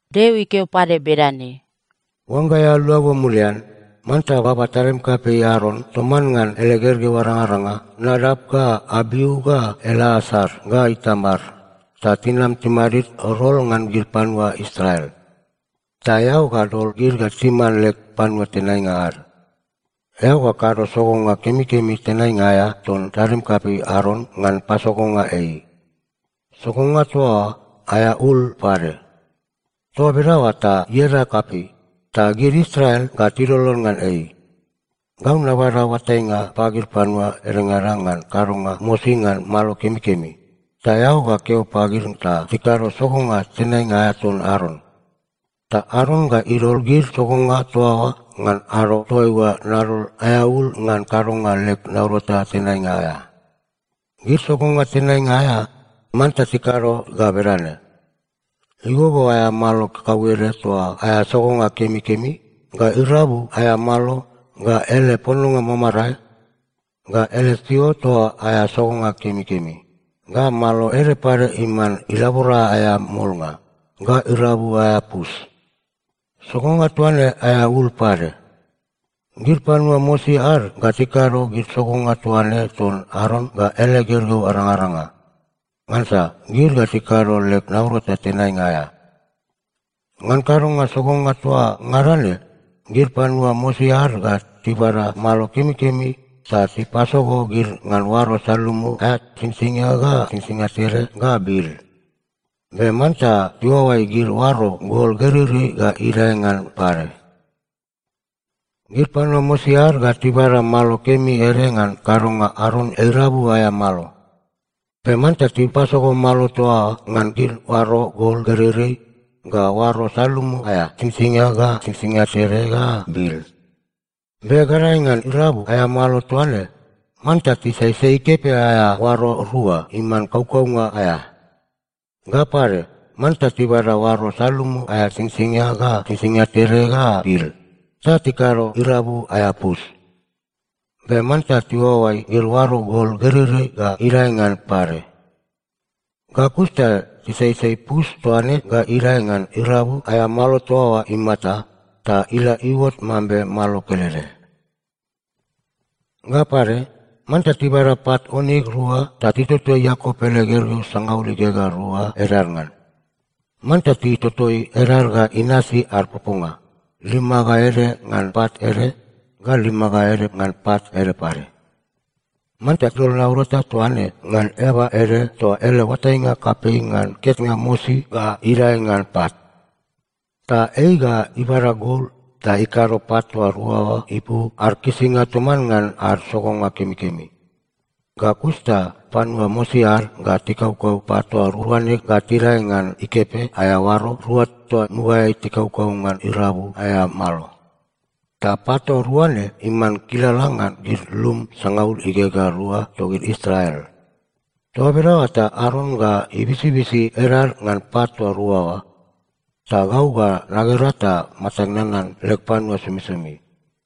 Deo ikeo pade bedane, “Oangga eao luago mulian, manta baba tadim kapei Aron toman ngan ele gergeu arangaranga Nadap ga Abiu ga Eleasar ga Itamar, ta tinam timadid rol ngan gid panua Israel. Ta eao ga dol gid ga timan leg panua tenainga ad. Eao ga kado sogonga kemikemi tenainga aea ton tadim kapei Aron ngan pasogonga ei. Sogonga toa oa aea ul pade. Toa bedaoa ta ieda kapei, ta gid Israel ga tilolon ngan ei. Gau nabada oatainga pagid panua edengada ngan kadonga mosi ngan malo kemikemi. Ta eao ga keo pagid ta tikado sogonga tenainga aea ton Aron. Ta Aron ga idol gid sogonga toa oa ngan ado toaiua nadol aea ul ngan kadonga leg naurata tenainga aea. Gid sogonga tenainga aea, manta tikado ga bedane: igogo aea malo kakauede toa aea sogonga kemikemi, ga irabu aea malo, ga ele pononga mamarae, ga ele siot toa aea sogonga kemikemi, ga malo ede pade iman ilabora aea molnga, ga irabu aea pus. Sogonga toa ne aea ul pade. Gid panua mosi ad ga tikado gid sogonga toa ne ton Aron ga ele gergeu arangaranga, ngansa gid ga tikado leg naurata tenainga aea. Ngan kadonga sogonga toa ngada ne, gid panua mosi ad ga tibada malo kemikemi ta tipasogo gid ngan oaro salumu aea singsingia ga singsingia tede ga bil. Be manta tiuaoai gid oaro gol gereirei ga idae ngan pade. “Gid panua mosi ad ga tibada malo kemi ede ngan kadonga Aron irabu aea malo. Be manta tipasogo malo toa oa ngan gid oaro gol gereirei ga oaro salumu aea singsingia ga singsingia tede ga bil. Be gadae ngan irabu aea malo toa ne, manta tisaisai ikepe aea oaro rua, iman kaukaunga aea. Ga pade, manta tibada oaro salumu aea singsingia ga singsingia tede ga bil ta tikado irabu aea pus. Be manta tiuaoai gid oaro gol gereirei ga idae ngan pade. Ga kus ta tisaisai pus toa ne ga idae ngan irabu aea malo toa oa imata, ta ila iuot mambe malo kelede. “Ga pade, manta tibada pat oniks rua ta titotoi Iakop ele gergeu sangaul igegea rua edad ngan. Manta titotoi edad ga inasi ad poponga, lima ga ede ngan pat ede, ga lima ga ede ngan pat ede pade. Manta dol naurata toa ne ngan eaba ede toa ele oatainga kapei ngan ketnga mosi ga idae ngan pat. Ta ei ga ibada gol ta ikado pat toa rua oa ipu ad kisinga toman ngan ad sogonga kemikemi. Ga kus ta panua mosi ad ga tikaukau pat toa rua ne ga tidae ngan ikepe aea oaro rua toa mugaeai tikaukau ngan irabu aea malo. Ta pat toa rua ne iman kilala ngan gid lum sangaul igegea rua togid Israel. Toa bedaoa ta Aron ga ibisibisi edad ngan pat toa rua oa, ta gau ga nagera ta matag nanan leg panua somisomi.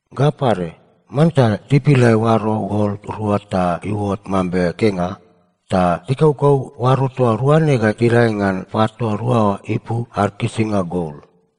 Ga pade, manta tipilai oaro gol rua ta iuot mambe kenga, ta tikaukau oaro toa rua ne ga tidae ngan pat toa rua oa ipu ad kisinga gol.”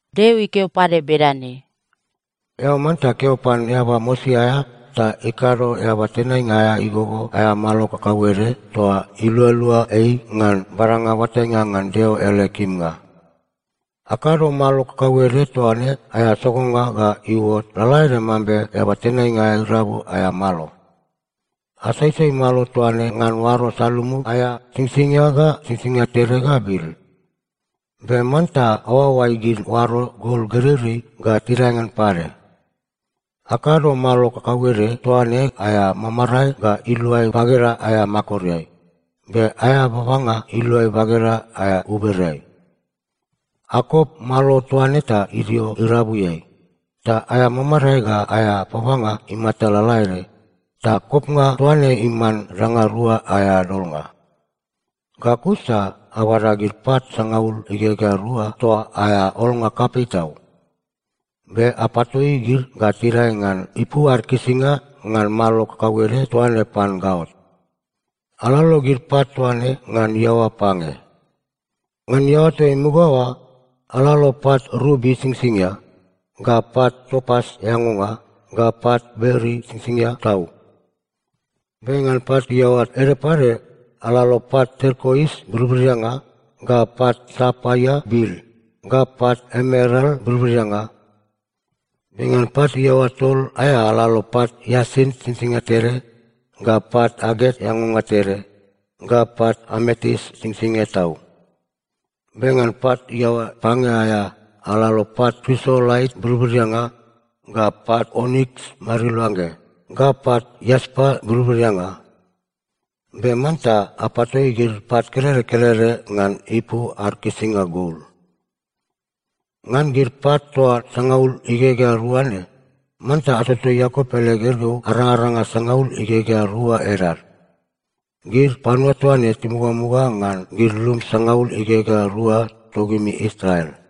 Deo ikeo pade bedane, “Eao manta keo pan eaba mosi aea ta ikado eaba tenainga aea igogo aea malo kakauede toa ilualua ei ngan badanga oatainga ngan Deo ele kimnga. Akado malo kakauede toa ne aea sogonga ga iuot lalaede mambe eaba tenainga aea irabu aea malo. Asaisai malo toa ne ngan oaro salumu aea singsingia ga singsingia tede ga bil. Be manta aoaoai gid oaro gol gereirei ga tidae ngan pade. Akado malo kakauede toa ne aea mamarae ga iluai bageda aea makoreai, be aea babanga iluai bageda aea ubereai. Akop malo toa ne ga idio irabuiai, ta aea mamarae ga aea babanga imata lalaede, ta kopnga toa ne iman danga rua aea dolnga. Ga kus ta abada gid pat sangaul igegea rua toa aea olnga kapei tau. Be apatoi gid ga tidae ngan ipu ad kisinga ngan malo kakauede toa ne pan gaot. Alalo gid pat toa ne ngan iaoa pange. Ngan iaoa toa imuga oa, alalo pat rubi singsingia, ga pat topas eangonga, ga pat beril singsingia tau. Be ngan pat iaoa ede pade, alalo pat terkois birbirianga, ga pat sapaia bil, ga pat emeral birbirianga. Be ngan pat iaoa tol aea, alalo pat iasint singsingia tede, ga pat aget eangonga tede, ga pat ametis singsingia tau. Be ngan pat iaoa pange aea, alalo pat krisolait birbirianga, ga pat oniks mariluangge, ga pat iaspa birbirianga. Be manta apatoi gid pat kelede kelede ngan ipu ad kisinga gol. Ngan gid pat toa sangaul igegea rua ne, manta atotoi Iakop ele gergeu arangaranga sangaul igegea rua edad. Gid panua toa ne timugamuga ngan gid lum sangaul igegea rua togimi Israel.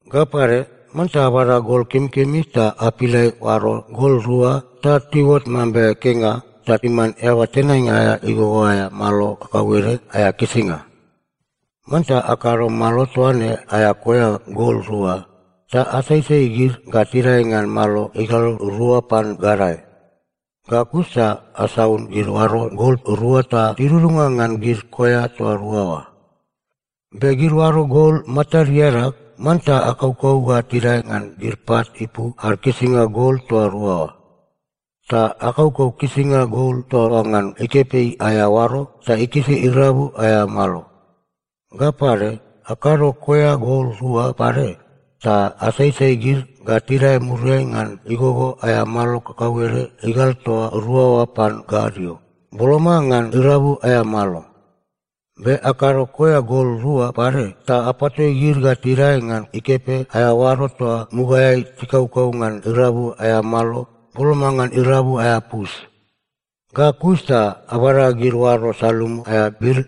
“Ga pade, manta abada gol kemikemi ta apilai oaro gol rua ta tiuot mambe kenga, ta iman eaba tenainga aea igogo aea malo kakauede aea kisinga. Manta akado malo toa ne aea koea gol rua, ta asaisai gid ga tidae ngan malo igal rua pan gadae. Ga kus ta asaun gid oaro gol rua ta tidudunga ngan gid koea toa rua oa. Be gid oaro gol matad iadag, manta akaukau ga tidae ngan gid pat ipu ad kisinga gol toa rua oa. Ta akaukau kisinga gol toa oa ngan ikepe aea oaro ta ikisi irabu aea malo. Ga pade, akado koea gol rua pade ta asaisai gid ga tidae muriai ngan igogo aea malo kakauede igal toa rua oa pan gadio, boloma ngan irabu aea malo. Be akado koea gol rua pade ta apatoi gid ga tidae ngan ikepe aea oaro toa mugaeai tikaukau ngan irabu aea malo, boloma ngan irabu aea pus. Ga kus ta abada gid oaro salumu aea bil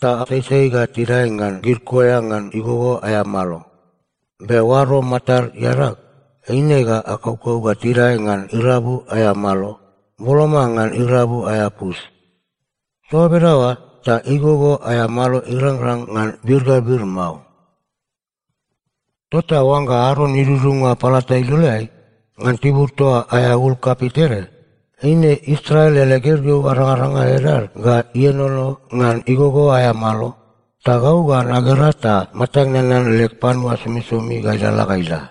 ta asaisai ga tidae ngan gid koea ngan igogo aea malo. Be oaro matad iadag, eine ga akaukau ga tidae ngan irabu aea malo, boloma ngan irabu aea pus. Toa bedaoa ta igogo aea malo irangrang ngan bir ga bir mao. “Tota oangga Aron idudunga palata iloleai, ngan tibur toa aea ul kapei tede, eine Israel ele gergeu arangaranga edad ga ienono ngan igogo aea malo, ta gau ga nagera ta matag nanan leg panua somisomi ga ilalala ga ila.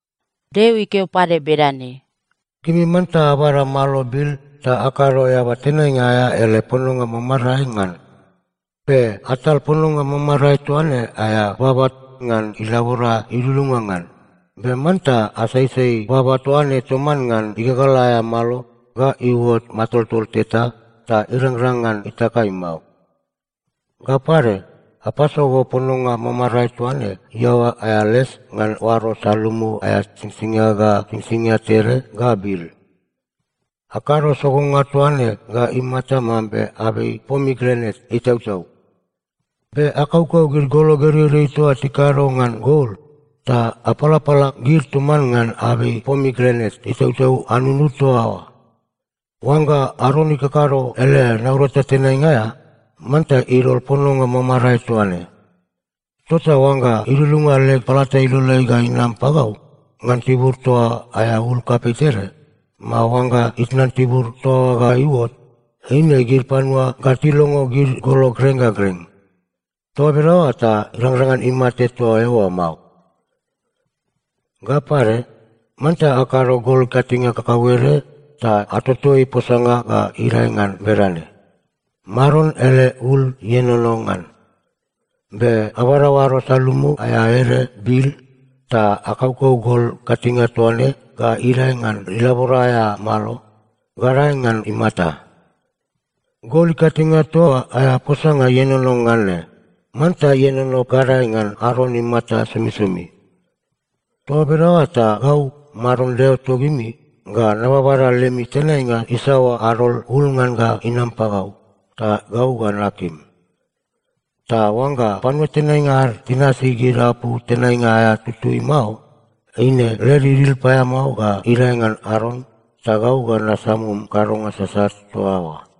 Deo ikeo pade bedane, “Gimi manta abada malo bil ta akado eaba tenainga aea ele pononga mamarae ngan. Be atal pononga mamarae toa ne aea baba ngan ilabora idudunga ngan. Be manta asaisai baba toa ne toman ngan igagal aea malo ga iuot matoltol teta ta irangrang ngan itakai mao. Ga pade, apasogo pononga mamarae toa ne iaoa aea les ngan oaro salumu aea singsingia ga singsingia tede ga bil. Akado sogonga toa ne ga imata mambe abei pomigranet itautau. Be akaukau gid golo gereirei toa tikado ngan gol, ta apalapala gid toman ngan abei pomigranet itautau anunud toa oa. Oangga Aron ikakado ele naurata tenainga aea, manta idol pononga mamarae toa ne. Tota oangga idudunga leg palata iloleai ga inam pagau, ngan tibur toa aea ul kapei tede, mao oangga itnan tibur toa oa ga iuot, eine gid panua ga tilongo gid golo greng ga greng. Toa bedaoa ta irangrang ngan imate toa eoa mao. “Ga pade, manta akado gol ikatinge kakauede ta atotoi posanga ga idae ngan bedane: Maron ele ul ienono ngan. Be abada oaro salumu aea ede bil, ta akaukau gol ikatinge toa ne ga idae ngan ilabora aea malo, gadae ngan imata. Gol ikatinge toa aea posanga ienono ngan ne, manta ienono gadae ngan Aron imata somisomi. Toa bedaoa ta gau, Maron Deo togimi, ga nababada lemi tenainga isaoa adol ul ngan ga inam pagau, ta gau ga nakim. Ta oangga panua tenainga ad tinasi gid apu tenainga aea tutui mao, eine led idil paeamao ga idae ngan Aron, ta gau ga nasamum kadonga sasat toa oa.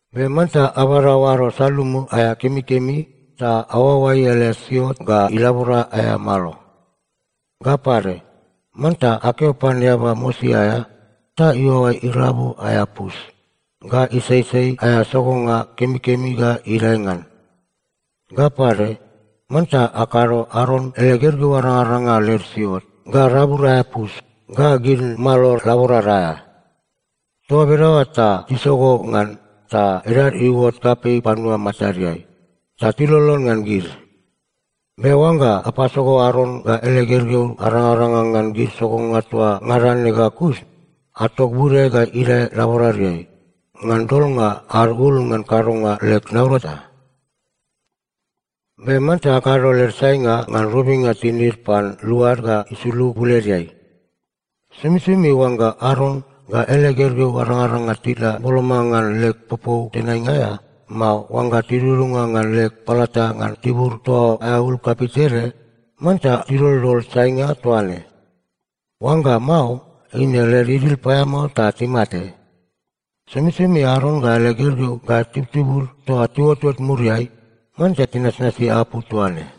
“Be manta abada oaro salumu aea kemikemi ta aoaoai ele siot ga ilabora aea malo. Ga pade, manta akeo pan eaba mosi aea ta iuaoai irabu aea pus, ga isaisai aea sogonga kemikemi ga idae ngan. Ga pade, manta akado Aron ele gergeu arangaranga led siot, ga rabud aea pus, ga gid malo laborad aea. Toa bedaoa ta tisogo ngan, ta edad iuot kapei panua matadeai, ta tilolon ngan gid. Be oangga apasogo Aron ga ele gergeu arangaranga ngan gid sogonga toa ngada ne ga kus, atok bude ga idae laboradeai, ngan dolnga ad ul ngan kadonga leg naurata. “Be manta akado led sainga ngan robinga tinid pan luad ga isulug buledeai. Somisomi oangga Aron ga ele gergeu arangaranga tila boloma ngan leg popou tenainga aea, mao oangga tidudunga ngan leg palata ngan tibur toa aea ul kapei tede, manta tidoldol sainga toa ne. Oangga mao, eine led idil paeamao ta timate. “Somisomi Aron ga ele gergeu ga itubtub toa tiuotot muriai, manta tinasnasi apu toa ne.”